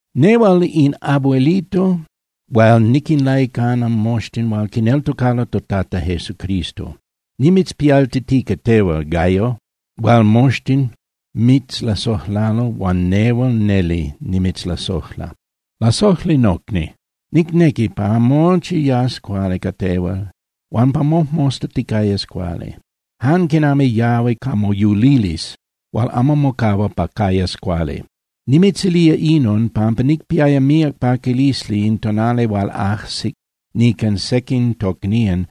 Nehual in abuelito hual niquinlaicana moxtin hual quineltocalo toTata Jesucristo, nimitzpialtitica tehual, Gayo, hual moxtin mitzlasojlalo huan nehual neli nimitzlasojla. Lasojli nocni, nicnequi pa mochi yas cuali ca tehual huan pa mojmosta ticayas cuali, jan quinami yahui ca moyulilisli hual amo mocahua pa cayas cuali. Nimitzilía inon, pampa nicpiaya míac paquilisli in tonali hual ajsije nican sequin tocnían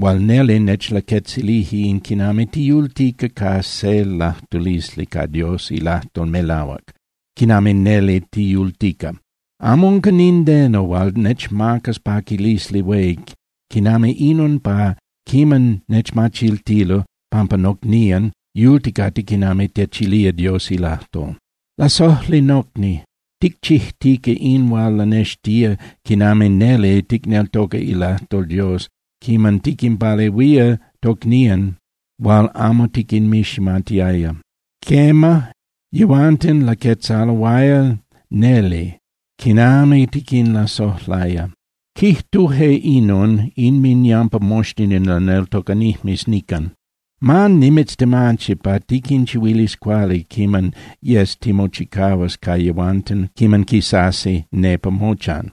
huan neli nechlaquetzilije in quinami tiyultica ca se lajtulisli ca Dios ilajtol melahuac, quinami neli tiyultica. Amo unca nindeno hual nechmacas paquilisli hué quinami inon pa quiman nechmachiltilo pampa nocnían yulticate quinami techilía Dios ilajtol. Lasojli nocni, ticchijtica in hual lanextía quinami neli ticneltoca ilajtol Dios quiman tiquinpalehuía tocnían hual amo tiquinmiximatiaya. Quema, yehuanten laquetzaloaya neli quinami tiquinlasojlaya. Quijtuje inon inminyampa moxtin in laneltocanijmes nican. Ma nimitztemachi pa tiquinchihuilis cuali quiman yes timochicahuas ca yehuanten quiman quisasi nepa mochan.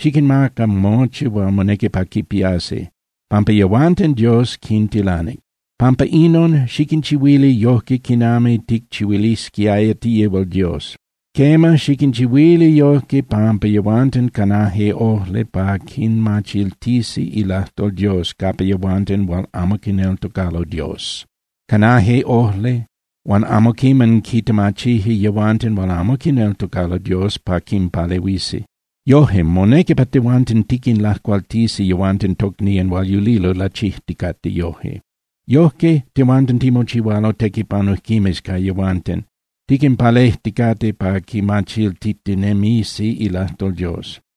Xiquinmaca mochi hual monequi pa quipiasi, pampa yehuanten Dios quintilanic. Pampa inon, xiquinchihuili yojque quinami ticchihuilisquiaya yihual Dios. Quema, xiquinchihuili yojque, pampa yehuanten canaje ojli pa quinmachiltisi ilajtol Dios capa yehuanten hual amo quineltocalo Dios. Canaje ojli huan amo quiman quintemachije yehuanten hual amo quineltocalo Dios pa quinpalehuisi. Yoje, monequi pa tehuanten tiquinlacualtisi yehuanten tocnían hual yulilo lachijticate yojque. Yojque tehuanten timochihualo tequipanujquimes ca yehuanten, tiquinpalejticate pa quimachiltitinemisi ilajtol Dios.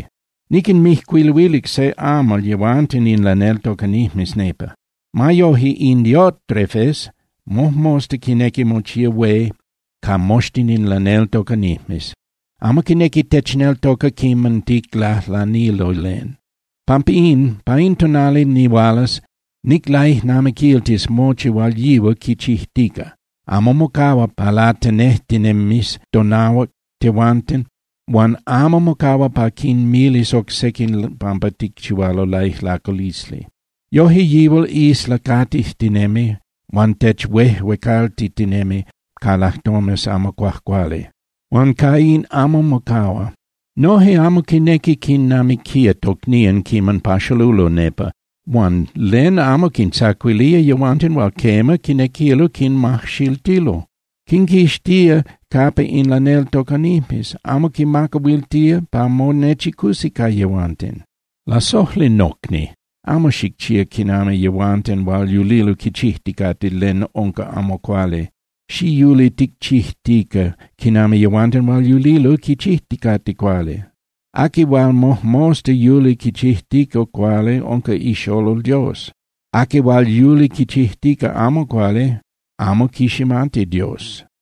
Niquinmijcuiluilic se amal yehuanten in laneltocanijmes nepa. Ma yoje, in Diótrefes mojmosta quinequi mochía hué ca moxtin in laneltocanijmes. Amo quinequi techneltoca quiman ticlajlanilo len. Pampa in, pa in tonali nihualas niclaijnamiquiltis mochi hual yihual quichijtica. Amo mocahua pa latenejtinemis tonahuac tehuanten huan amo mocahua pa quinmilis oc sequin pampa ticchihualo laijlaculisli. Yoje yihual islacatijtinemi, huan techuejuecaltitinemi ca lajtomes amo cuajcuali. Huan ca in amo mocahua. Noje amo quinequi quinnamiquía tocnían quiman paxalulo nepa, huan ¡len amo quintzacuilía yehuanten hual quema, quinequilo quinmajxiltilo! Quinquixtía capa in laneltocanijmes, amo quinmacahuiltía pa monechicusi ca yehuanten. Lasojli nocni, amo xicchía quinami yehuanten hual yulilo quichijticate len unca amo cuali. Xiyuli ticchijtica quinami yehuanten hual yulilo quichijticate cuali. Aqui hual mojmosta yuli quichijtica cuali unca ixolol Dios. Aqui hual yuli quichijtica amo cuali amo quiximati Dios.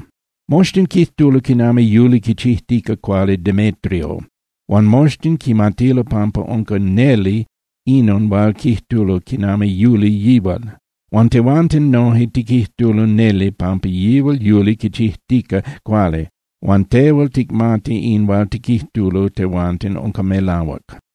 Moxtin quijtulo quinami yuli quichijtica cuali Demétrio huan moxtin quimatilo pampa unca neli inon hual quijtulo quinami yuli yihual. Huan tehuanten noje tiquijtulo neli pampa yihual yuli quichijtica cuali, huan tehual ticmati in hual tiquijtulo tehuanten unca melahuac.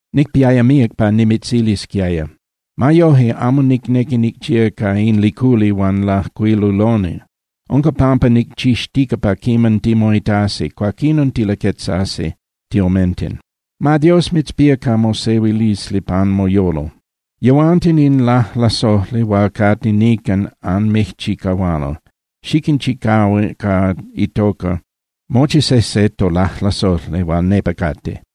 Nicpiaya míac pa nimitzilisquiaya. Ma yoje, amo nicnequi nicchía ca in liculi huan lajcuiluloni. Unca pampa nicchixtica pa quiman timoitasi, cuaquinon tilaquetzasi tiomenten. Ma Dios mitzpía ca mosehuilisli pan moyolo. Yehuanten in lajlasojli hual cate nican anmijchicahualo. Xiquinchicahua ca itoca mochi sejse tolajlasojli hual nepa cate.